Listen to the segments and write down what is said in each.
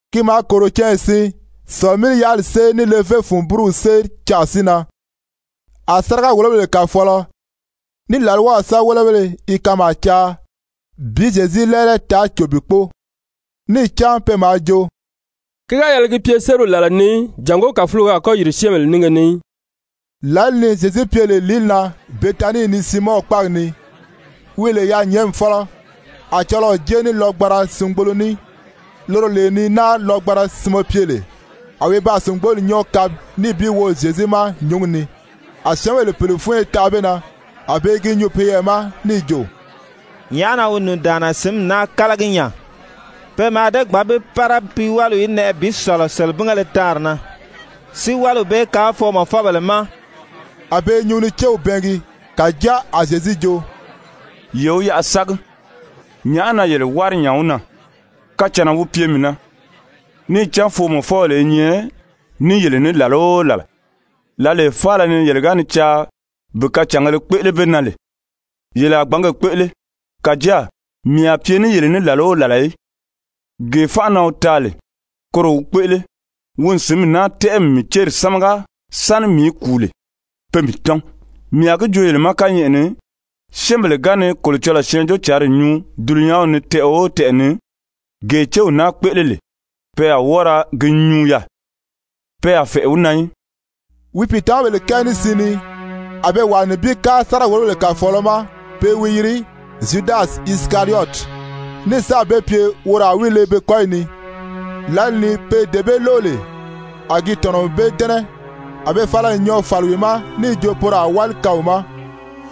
Ki maa kòro canya siin Sɔ̀lɔ-mí-yaʔali séri ní levé fun búruw séri canʔa si nan. A sáriga-wòlobèle kàfɔɔlɔ ní làlwaw sɛ́bɛwelebéle i kanmaa caa bi Zyezu lɛ́ɛlɛ taa cò bi kpóo. Níì cán pe maa jo: «Ki ga yɛlɛ gi pye sériw làla ni í jàngó kàfulogo a kɔ́ yìri syɛ́ɛnbèle nínge ni í.» Lǎli ni Zyezu pye lè lìíli na Betanii ni Siimɔn kpáagi ni wi lè yaanyɛɛnmi fɔ́lɔ, a cɔlɔɔ jée ní lɔgbanra singbolo ní, loro lee ni náari lɔgbanra sinmɛ pye lè. A wi baa sìngboli nyɔ́ɔ kabi níì bi wo Zyezu ma nyǔngi ni. A syɛ́ɛnbèle pèle fúnyo tanʔa be na, a be i gi nyuu peyɛɛ ma níì jo: «Nyàʔá na wi nùndaanna sǐnmi naa kálagi nya? Pe mǎà dée gbǎn bi pára pi wáliw í nɛʔɛ bi sɔ̀lɔ selebingéle taanri na, si wáliw bee kaan foomɔfɔbèle ma.» A be i nyuu ni céw bɛɛngi. Kàjáa a Zyezu jo: «Ye wi yaʔa sági. Nyàʔá na yele wári nya wi na? Kacànna wi pye mii na. Níì cán foomɔfɔbèle i nyɛ ní yele ní làla o làla, lǎlee faala ni yele ga ni caa bi kacàngēle kpéʔele be na lè, yele a gbǎn ge kpéʔele, kàjáa mii a pye ní yele ní làla o làla í. Gee fánʔa na wi taa lè, koro wi kpéʔele. Wi n sǐnmi naa tɛ́ʔɛ n mii céri sámaga sáni mii í kùu lè pé mii tɔ́n. Mii a gi joo yele ma kányɛʔɛ ni, syɛ́ɛnbèle ga ni Kolocɔlɔɔ Syɛɛnjóocǎnri nyuu dulunyanw ni tɛʔɛ o tɛʔɛ ni, gee céw naa kpéʔele lè, pe a wɔ́ɔ ra gi nyuu yaà, pe a fɛ̀ʔɛ wi na í.» Wi pìitamabèle kɛɛ ní siin ni, a be wàa nibin kári sáriga-wòlobèle kàfɔɔlɔ ma, pe i wi yiri Zyudasi Isikariyɔti, ní sáà be pye woro a wi le be kɔ́yi ni. Lǎli ni pe dee bee lóʔo lè, a gi tɔ̀nɔ n be dɛ́nɛ, a be fala n nyɔɔ fàli wi ma níì jo poro a wáli kaan wi ma.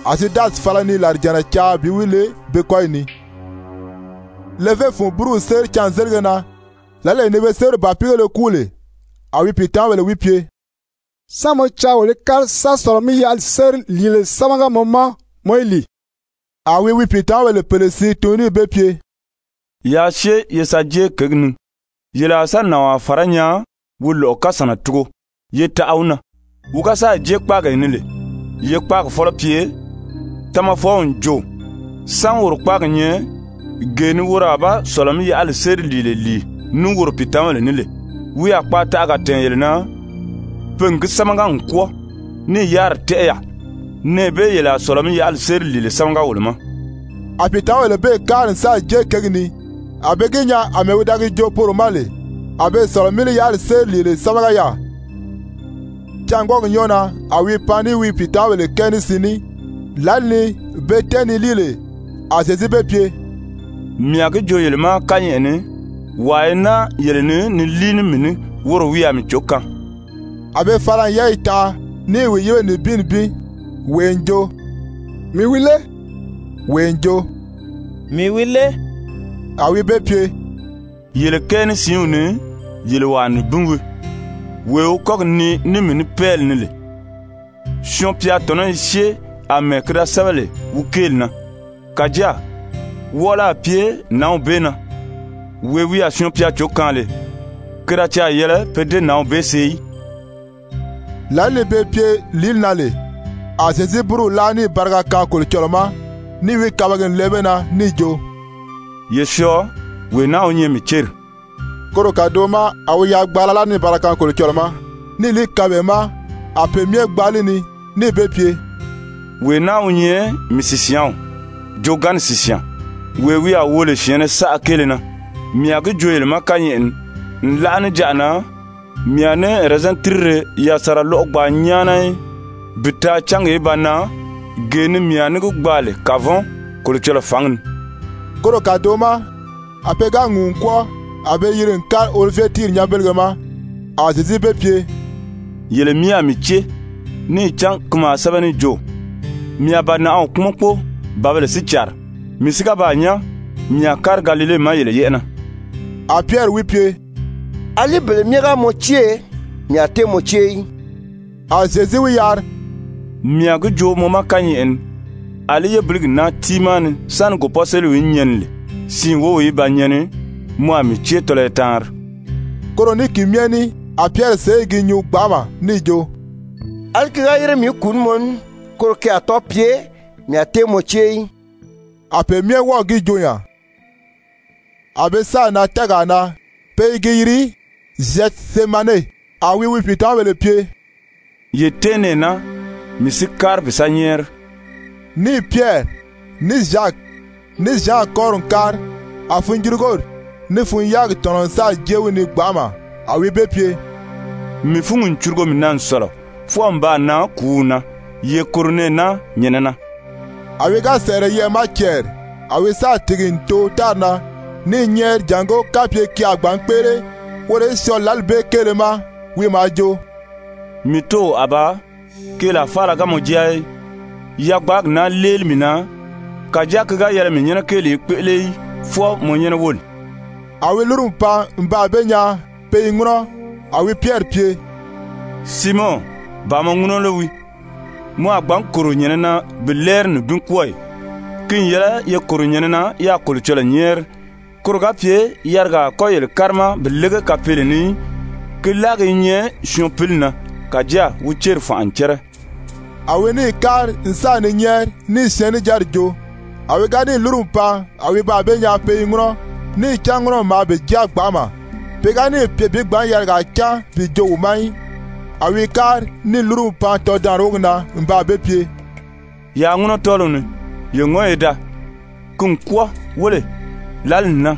A Zyudasi fala ni làrijànna caa bi wi le be kɔ́yi ni. Levé fun búruw séri cânzelige na, lǎlee ni pe sériw bàpiigéle kúu lè, a wi pìitamabèle wi pye: «Sán mɔ caa wolo í kári sa Sɔ̀lɔ-mí-yaʔali séri lìile sámaga mɔ ma mɔ í lìi?» A wi wi pìitamabèle pèle siin tun níì be pye: «Yaa syée ye sa jée kěgi ni, yele a sa nànwaa fàrá nyaa wi lɔ̀ʔɔ kasànna tugo, ye taʔa wi na. Wi ga sáà jée kpáagee ni lè, ye kpáagi fɔ́lɔ pye: ‹Tamafɔw n jo, sán woro kpáagi nyɛ, gee ni woro a ba Sɔ̀lɔ-mí-yaʔali séri lìile lìi ní woro pìitamabèle ní lè?› Wi a kpaataʔaga tɛ̀ɛn yele na. Pe n gi sámaga n kwɔ́ɔ níì yáriri tɛ́ʔɛ yaà. Nɛɛ bee yele a Sɔ̀lɔ-mí-yaʔali séri lìile sámaga wolo ma.» A pìitamabèle bee kári n sáà jée kěgi ni, a be gi nyaa àmɛɛ wi da gi joo poro ma lè, a be Sɔ̀lɔ-mí-yaʔali séri lìile sámaga yaà. Cângwɔɔgi nyɔ́ɔ na a wi pan ní wi pìitamabèle kɛɛ ní siin ní. Lǎli ni be tɛ́ɛn ni líi lè, a Zyezu be pye: «Mii a gi joo yele ma kányɛʔɛ ni, wàa i naa yele ni ni líi ní mii ní, woro wi a mii cǒ kaan.» A be fala n yɛ́ɛyi tanʔa ní i wi yíbe nibin nibin, wee n jo: «Mii wi lé?» Wee n jo: «Mii wi lé?» A wi be pye: «Yele kɛɛ ní siinw ni, yele wàa nibin wii, wee wi kɔ́gi nii ní mii ní pɛ́ɛli ni lè. Syɔɔn-pya tɔ̀nɔ́ i syée àmɛɛ ki da sɛ́bɛ lè wi kéeli na. Kàjáa wɔʔɔlɔ a pye nǎnw bee na, wee wi a Syɔɔn-pya cǒ kaan lè! Ki da caà yɛlɛ pe dée nǎnw bee see í.» Lǎli ni be pye lìíli na lè a Zyezu búruw láa níì bariga kaan Kolocɔlɔɔ ma, níì wi kabagi n lɛɛ be na níì jo: «Ye syɔɔ, wee naa wi nyɛ mii céri.» Koro kàdoʔo ma a wi yagbaala láa níì bariga kaan Kolocɔlɔɔ ma, níì li kaan be ma, a pe myɛ gbaa li ni. Níì be pye: «Wee naa wi nyɛ mii sìsyaanw, joogaanni sìsyaan, wee wi a wo lè syɛ̀ɛnnɛ saʔa kéele na. Mii a gi joo yele ma kányɛʔɛ ni, nlaʔa níjanʔa na mii a ní ɛrɛzɛn tírire yasanra lɔ́ʔɔ gbaa nyáana í bi taa cángi í ba nan gee ni mii a ní gi gbaa lè kavɔn Kolocɔlɔɔ fǎngi ni.» Koro kàdoʔo ma a pe ga ŋùu n kwɔ́ɔ, a be yiri n kári Olivye tíiri nyanbelege ma. A Zyezu be pye: «Yele myɛ a mii cée, níì cán ki maa sɛ́bɛ níì jo: ‹Mii a bànaʔaw kpúmɔn kpóo, bǎbèle si càri.› Mii si ga baa nyán, mii a kári Galile ma yele yɛ́ʔɛ na.» A Pyɛri wi pye: «Alí bele myɛ ga mɔ cée, mii a tée mɔ cée í.» A Zyezu wi yari: «Mii a gi joo mɔ ma kányɛʔɛ ni, àlí yébiligi naa tiimaa ni sáni gòpɔ́seliw í nyɛni lè, siin wów í ba nyɛni, mɔ a mii cée tɔlɔyɔ taanri.» Koro ní ki myɛ ní, a Pyɛri sèʔé i gi nyuu gbanʔama níì jo: «Alí ki ga yére mii í kùu ní mɔ ní, koro ki a tɔ́ɔ pye, mii a tée mɔ cée í.» A pe myɛ wɔ́ɔ̀ gi joo nya. A be sáà nan tɛɛgaa na pe i gi yiri Zyɛtisemane. A wi wi pìitamabèle pye: «Ye tɛ́ɛn nɛɛ naa, mii si kári bi sa nyɛ́ɛri.» Níì Pyɛri, ní Zyaki, ní Zyan kɔ́ri n kári, a funjurugori ní fun-yáagi tɔ̀nɔ n sáà jée wi ni gbanʔama. A wi be pye: «Mii fúngi n curugo mii na n sɔ̀lɔ, fwɔɔ n baa nan kùúw na. Ye kòro nɛɛ naa nyɛ̀nɛ na.» A wi ga sɛ̀ʔɛrɛ yɛʔɛ̀ ma cɛɛri, a wi sáà tìgi n too tári na ní i nyɛ́ɛri jàngó kapye ki a gbǎn kpéʔele woro í syɔɔ lǎli bee kéele ma. Wi maa jo: «Mii Tóow Abaa, keelaa faala ga mɔ jáa í, yagbaagi naa léeli mii na, kàjáa ki ga yɛlɛ mii nyɛ́nɛ kéeli í kpéʔele í, fwɔɔ mɔ nyɛ́nɛ wóli.» A wi lúru n pan n baa be nyaa pe i ŋúnɔ, a wi Pyɛri pye: «Siimɔn, ba mɔ ŋúnɔ lé wii? Mɔ a gbǎn kòro nyɛ̀nɛ na bi lɛ́ɛri nibin kwɔ́ɔ ì? Ki n yɛlɛ ye kòro nyɛ̀nɛ na yaa Kolocɔlɔɔ nyɛ́ɛri, koro ga pye yarigaa a kɔ́ yele kárima bi lége kapeele ni í. Ki láagi i nyɛ syɔɔn pili na, kàjáa wi céri fànʔa n cɛ́rɛ.» A wi níì kári n sa ni nyɛ́ɛri, níì syɛɛnnijanri joo. A wi ga níì lúru n pan, a wi baa be nyaa pe i ŋúnɔ. Níì cán ŋúnɔmi maa be jáa gbanʔama. Pe ga níì pye bi gbǎn yarigaa cán bi joo wi ma í. A wi kári níì lúru n pan tɔdaanri wógi na n baa be pye: «Yaa ŋúnɔ tɔ́ɔliw ni, ye ŋɔ́n ye daa. Ki n kwɔ́ɔ. Wéle, lǎli n nan,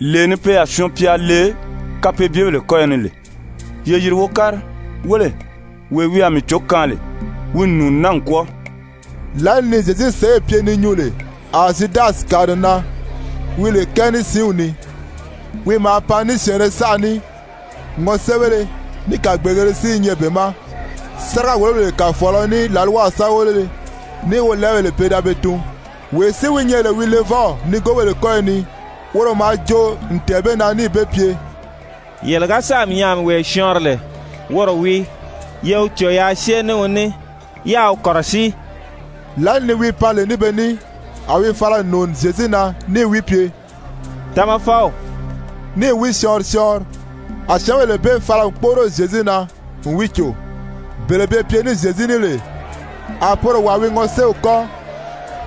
lee ni pe a Syɔɔn-pya le kapeebyebèle kɔ́yɔ ni lè. Ye yìri wo kári. Wéle, wee wi a mii cǒ kaan lè, wi n nùuni naa n kwɔ́ɔ.» Lǎli ni Zyezu sèʔê pye ni nyuu lè, a Zyudasi kàri n nan, wi lè kɛɛ ní siinw ni, wi maa pan ní syɛ̀ɛnnɛ saʔa ní, ŋɔséebéle ní kàgbeegēle si i nyɛ be ma, sáriga-wòlobèle kàfɔɔlɔ ní làlwaw sɛ́bɛwelebéle ní wolɛɛbèle pe da be tun. Wee si wi nyɛ lè wi levɔw nigoobèle kɔ́yɔ ni, woro maa joo n tɛ̀ɛn be na níì be pye: «Yele ga sáà mii nyaa a mii wee syɔɔnri lè, woro wii. Ye wi cò yaa syée ní wi ní, yáā wi kɔ̀rɔsíi.» Lǎli ni wi pan lè ní be ní, a wi fala n nùuni Zyezu na níì wi pye: «Tamafɔw.» Níì wi syɔɔnri syɔɔnri. A syɛ́ɛnbèle bee fala n kpóʔoro Zyezu na n wi cò. Bele be pye ní Zyezu ní lè, a poro wàa wi ŋɔséew kɔ́n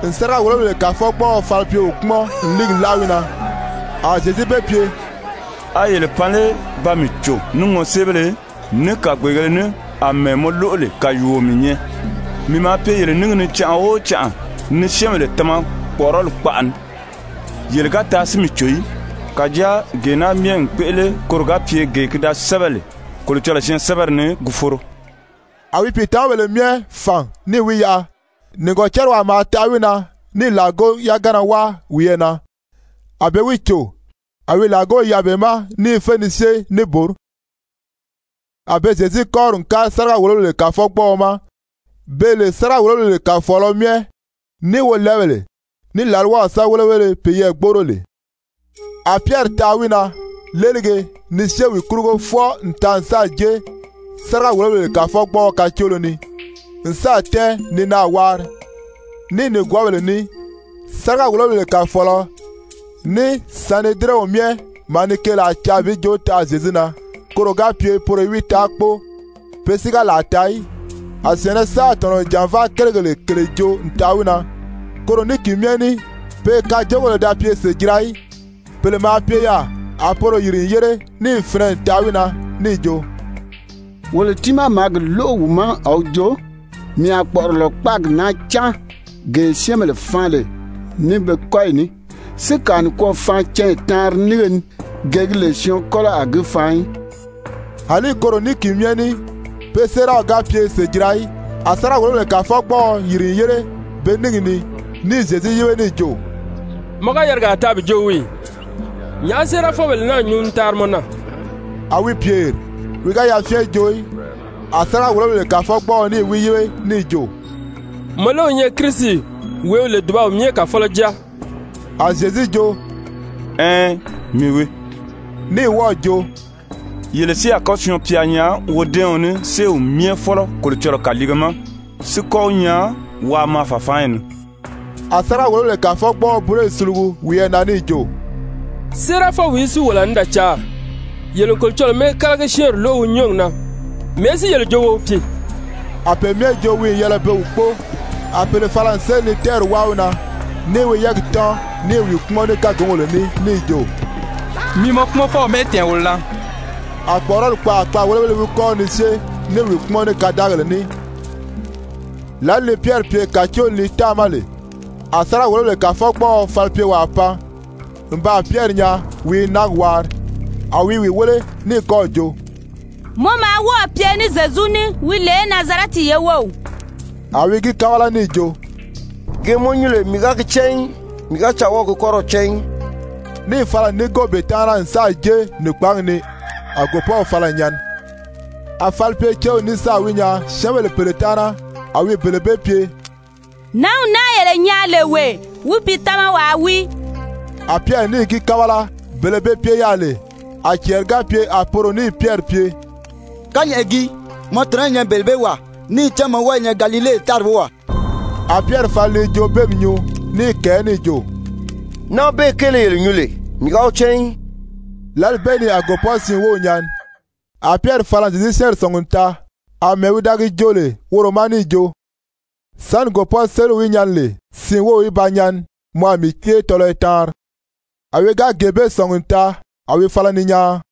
n sáriga-wòlobèle kàfɔgbɔɔɔ falipyeo kpúmɔn n líigi láʔa wi na. A Zyezu be pye: «A yele pan lé ba mii cò ní ŋɔséebéle, ní kàgbeegēle ní, àmɛɛ mɔ lóʔo lè kàyuuo mii nyɛ? Mii maa pye yele níngi ni canʔa o canʔa ni syɛ́ɛnbèle tama kpɔ̀ʔɔrɔli kpaʔa ni, yele ga taa si mii cò í. Kàjáa gee naa myɛ n kpéʔele koro ga pye gee ki da sɛ́bɛ lè Kolocɔlɔɔ syɛɛnsɛbɛri ni, gi foro.» A wi pìitamabèle myɛ fàn níì wi yaʔa. Nìgɔcariwaa maa taʔa wi na níì làgo yagana wáa wiyɛɛ na, a be wi cò. A wi làgow yaʔa be ma ní i fé ni syée níbori. A be Zyezu kɔ́ri n kári sáriga-wòlobèle kàfɔgbɔɔɔma, beè lè sáriga-wòlobèle kàfɔɔlɔ myɛ, ní wolɛɛbèle, ní làlwaw sɛ́bɛwelebéle peyɛɛ gbóʔoro lè. A Pyɛri taʔa wi na léelige ni syée wi kurugo fwɔɔ n taa n sáà jée sáriga-wòlobèle kàfɔgbɔɔɔ kàcoolo ni, n sáà tɛ́ɛn ni naà waari ní nìgwɔɔbèle ní. Sáriga-wòlobèle kàfɔɔlɔ ní Sanedirɛnw myɛ maa ni keelaa caa bi joo taʔa Zyezu na, koro ga pye poro í wi taa kpóo, pe si ga làa taa í. A syɛ̀ɛnnɛ saʔa tɔ̀nɔ n jànvaa kérigèle kèle joo n taʔa wi na, koro ní ki myɛ ní pe kajoogèle da pye sèjira í. Pèle maa pye yaà, a poro yìri n yére, níì finɛ n taʔa wi na níì jo: «Wolo tiimaa maa gi lóʔo wi ma a wi jo: ‹Mii a kpɔ̀ʔɔrɔlɔ kpáagi naa cáan, gee syɛ́ɛnbèle faan lè ní be kɔ́yi ní, si kàa nikwɔɔ faan canya taanri nínge ni, gee gi lè syɔɔn kɔ́lɔ a gi faan í.›» Alí koro ní ki myɛ ní, pe séeraw ga sèʔê pye sèjira í. A sáriga-wòlobèle kàfɔgbɔɔɔ yìri n yére be níngi ni, níì Zyezu yíbe níì jo: «Mɔ ga yarigaa taa bi joo wii ì? Nyàʔá séerafɔbèle naa nyuu ni taari mɔ na?» A wi pyèri, wi ga yafyɛn joo í. A sáriga-wòlobèle kàfɔgbɔɔɔ níì wi yíbe níì jo: «Mɔ lé wi nyɛ Kirisi wee wi lè dùbaw myɛ Kàfɔlɔ jáa?» A Zyezu jo: «Ɛɛn, mii wii.» Ní wɔ́ɔ̀ jo: «Yele si a kɔ́ Syɔɔn-pya nyaa wodɛ́ɛɔn ní, séew myɛ fɔ́lɔ Kolocɔlɔɔ kàliige ma, si kɔ́ wi nyaa waa maa fàfaanyi ni.» A sáriga-wòlobèle kàfɔgbɔɔɔ búroyi sulugu wiyɛɛ na níì jo: «Séerafɔwìí si wolo a ní da caa? Yele n Kolocɔlɔɔ mɛ́ɛkalagi-syɛ́ɛnri lóʔo wi nyɔ́ɔgi na. Mɛ̀ɛ́ si yele jo wo wi pye?» A pe myɛ jo wi n yɛlɛ be wi kpóo. A pèle fala n séli ni tɛ́ɛri wáa wi na, níì wi yɛ́ɛgi tɔ́n ní i wi kpúmɔn ní kágungèle ní níì jo: «Mi mɔ kpúmɔnfɔw mɛ́ʔɛ tɛ̀ɛn wolo na.» A kpɔ̀ʔɔrɔli kpaʔa kpaàwelebéle wi kɔ́ri ni syée ní i wi kpúmɔn ní kadaagèle ní. Lǎli ni Pyɛri pye kàcooli ni táàma lè, a sáriga-wòlobèle kàfɔgbɔɔɔ falipyecewaa pan n baa Pyɛri nyaa wi i náagi waari, a wi i wi wéle, ní kɔ́ɔ̀ jo: «Mɔ maa wɔ́ɔ̀ pye ní Zyezu ní wi lè Nazarɛti ye wów.» A wi gi kábala níì jo: «Gee mɔ nyuu lè mii ga gi cán í, mii ga caa wɔ́ɔ̀ gi kɔ́rɔw cán í.» Níì fala n núngo be taana n sáà jée nìkpaangi ni. [A gòpɔ́w fala n nyɛni.] A falipyecew ní sáà wi nyaa syɛ́ɛnbèle pèle taana, a wi bele bee pye: «Nǎnw naa yele nyaa lè wee, wi pìitamawaa wii.» A Pyɛri níì gi kábala. Bele be pye yaà lè, a cɛɛri ga pye a poro níì Pyɛri pye: «Kányɛʔɛ gii, mɔ tɔ̀nɔ́ i nyɛ bele bee wàa, níì cán mɔ wɔ́ɔ i nyɛ Galile tári wówaa.» A Pyɛri fala ni joobeemi nyuu, ní i kɛ̀ɛ́ níì jo: «Nǎnw bee kéele yele nyuu lè, mii ga wi cán í.» Lǎli bee ni a gòpɔ́siin wów nyɛni. A Pyɛri fala n Zyezu syɛ́ɛnri sɔ̀ngi n taa àmɛɛ wi da gi joo lè woro ma níì jo: «Sáni gòpɔ́seliw í nyɛni lè siin wów í ba nyɛni, mɔ a mii cée tɔlɔyɔ taanri.» A wi ga gee bee sɔ̀ngi n taa a wi fala ni nyaan.